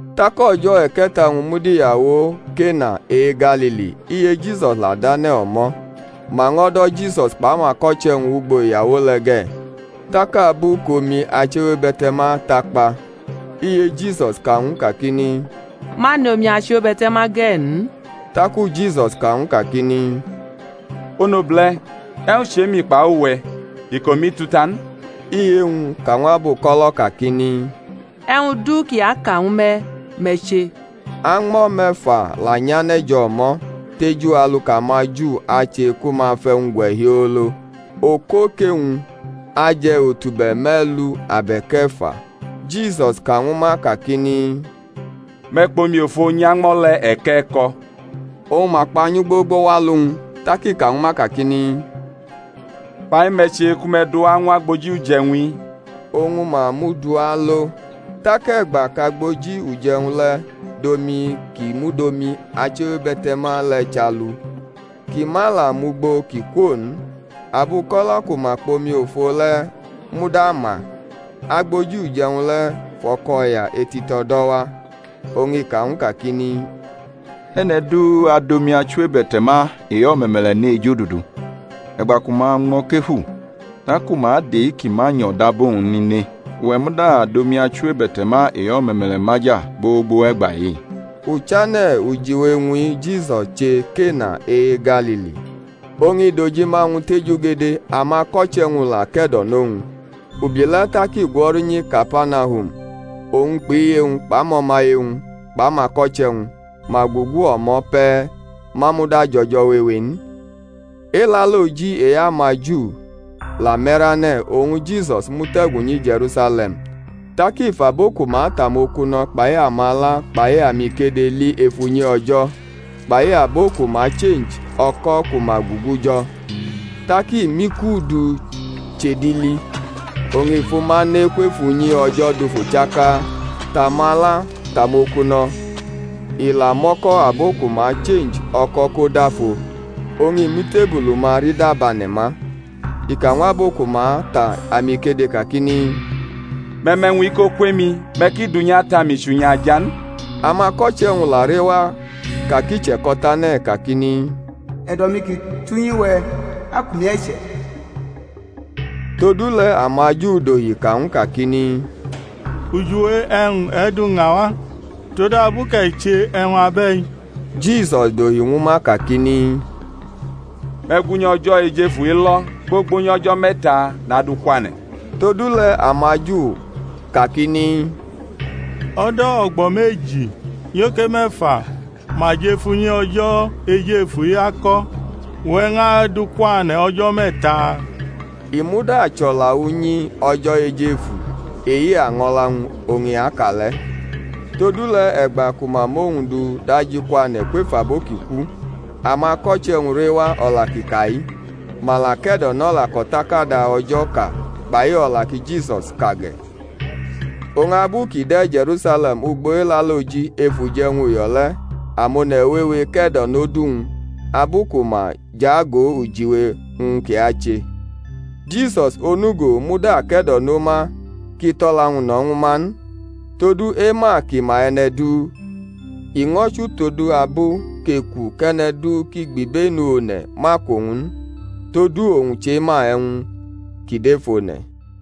Tak o̩jo̩ e̩ke̩ta-wñ mud iyawo Kena e-Galili; iye Jisus la dʼane̩ o̩mo̩. Ma ño̩ do̩ Jisus kpʼamako̩che̩-wñ wʼugbo iyawo le̩ ge̩. Tak abu kʼomi achiwebe̩te̩ma takpa, iye Jisus ka ñw u kakini, Ma nʼomi achiwebe̩te̩ma ge̩ n. Taku Jisus ka ñw u kakini, Onobule̩, e̩wñ chʼe-mi kpai uwe̩? Iko-mi tu ta n. Iye-wñ ka ñw abuko̩lo̩ kakini, E̩wñ du kʼi aka ñwu me̩, me̩ che. Añmo̩ me̩fa la nyane̩ jʼo̩mo̩, teju alu kʼamaJu ache ku ma fʼe̩wñ gwe̩ hiolo, okoke-wñ aje̩ otube̩ me̩lu abe̩k e̩fa. Jisus ka ñwu ma kakini, Me̩ kpʼomi ofo nyʼañmo̩ le̩ e̩kʼe̩ko̩. Oñ ma kpanyʼu gbogbo wʼalu-wñ. Tak i ka ñwu ma kakini, Fa-i me̩ che ku me̩ du wa ñw agboji uje̩wñ-i. Oñ mʼa mʼu du alo. Tak e̩gba kʼagboji uje̩wñ le̩ dʼomi ki mud omi achiwebe̩te̩ma le̩ chʼalu, kʼi ma la mʼugbo kʼi kwo n, (abuko̩lo̩ ku ma kpʼomifo le̩ muda ma), agboji uje̩wñ le̩ fʼo̩ko̩ya etito̩ do̩wa, oñ i ka ñw u kakini, E̩ne̩ du adʼomi achiwebe̩te̩ma e-o̩me̩me̩le̩ ne ejodudu, e̩gba ku ma ñmʼo̩ kefu (taku ma adʼe-ki ma nyo̩ dab owñ n ne); uwe̩ muda dʼomi achiwebe̩te̩ma e-o̩me̩me̩le̩ maja gbogbo wʼe̩gba-i. Uchane̩ ujiwe-wñ-i Jisus che Kena e-Galili. Oñ i dʼojima-wñ tejugede. Amako̩che̩-wñ la ke̩do̩nʼowñ. Ubi le̩ tak i gwo̩ru nyi Kapanahum, owñ kpʼiye-wñ kpʼamo̩maye-wñ kpʼamako̩che̩-wñ. Ma gugu o̩mo̩ pe̩, ma muda jʼo̩jo̩ wewe n. Elaloji e-amaJu la me̩rane̩; oñ Jisus mute̩gu nyi Je̩rusale̩m. Tak i fʼabo ku ma ta amokuno̩ kpai amala kpai amikede li ef unyi O̩jo̩, kpai abo ku ma chenji o̩ko̩ ku ma gugu jo̩. Tak i mʼiku du chʼedili. Oñ i fʼuma ne kwef unyi O̩jo̩ dufu chaka, tʼamala, tʼamokuno̩; i la mʼo̩ko̩ abo ku ma chenji o̩ko̩ ko dafo, oñ i mʼitebulu-ma rida bane̩ma. I ka ñw abo ku ma ta amikede kakini, Me̩ mʼe̩wñ-i ko kwemi, me̩ ki dʼunyi Ata-mi chʼunyi-aja n. Amako̩che̩-wñ la rewa ka kʼi che̩ko̩tane̩ kakini, E̩do̩-mi ki tʼunyi-we̩ akʼumi e̩che̩. Todule̩ amaJu dohi ka ñw u kakini, Ujiwe e̩wñ e̩ duña wa, todabu kʼe̩ che e̩wñ abe̩i? Jisus dohi ñwu ma kakini, Me̩ gu unyi O̩jo̩ ejefu-i lo̩, gbogbo nyʼo̩jo̩ me̩ta nadʼu kwane̩. Todule̩ amaJu kakini, O̩do̩ o̩gbo̩ meji nyoke me̩fa ma jʼef unyi O̩jo̩ ejefu-i ako̩, uwe̩ ñʼadʼu kwane̩ o̩jo̩ me̩ta? I muda chʼo̩la unyi O̩jo̩ ejefu e-año̩la-wñ oñ i ka le̩. Todule̩ e̩gba ku ma mʼowñ du dajikwane̩ kwef abo ki ku, amako̩che̩-wñ rewa o̩la kʼi ka-i, ma la ke̩do̩nʼo̩la kʼo̩takada O̩jo̩ ka kpai o̩la ki Jisus ka ge̩. Oñ abu kʼi de̩ Je̩rusale̩m ugbo Elaloji ef uje̩wñ uyo̩ le̩, amone̩ wewe ke̩do̩nʼodu-wñ, abu ku ma jʼago ujiwe-wñ kʼi ache. Jisus onugo muda ke̩do̩no ma kʼi tʼo̩la-wñ no̩ ñwu ma n, todu ema kʼi ma e̩ne̩ du, i ño̩ chʼutodabu kʼeku kʼe̩ne̩ du ki gbibenu one̩ ma ku owñ n; todu owñ chema e̩wñ ki dʼef one̩.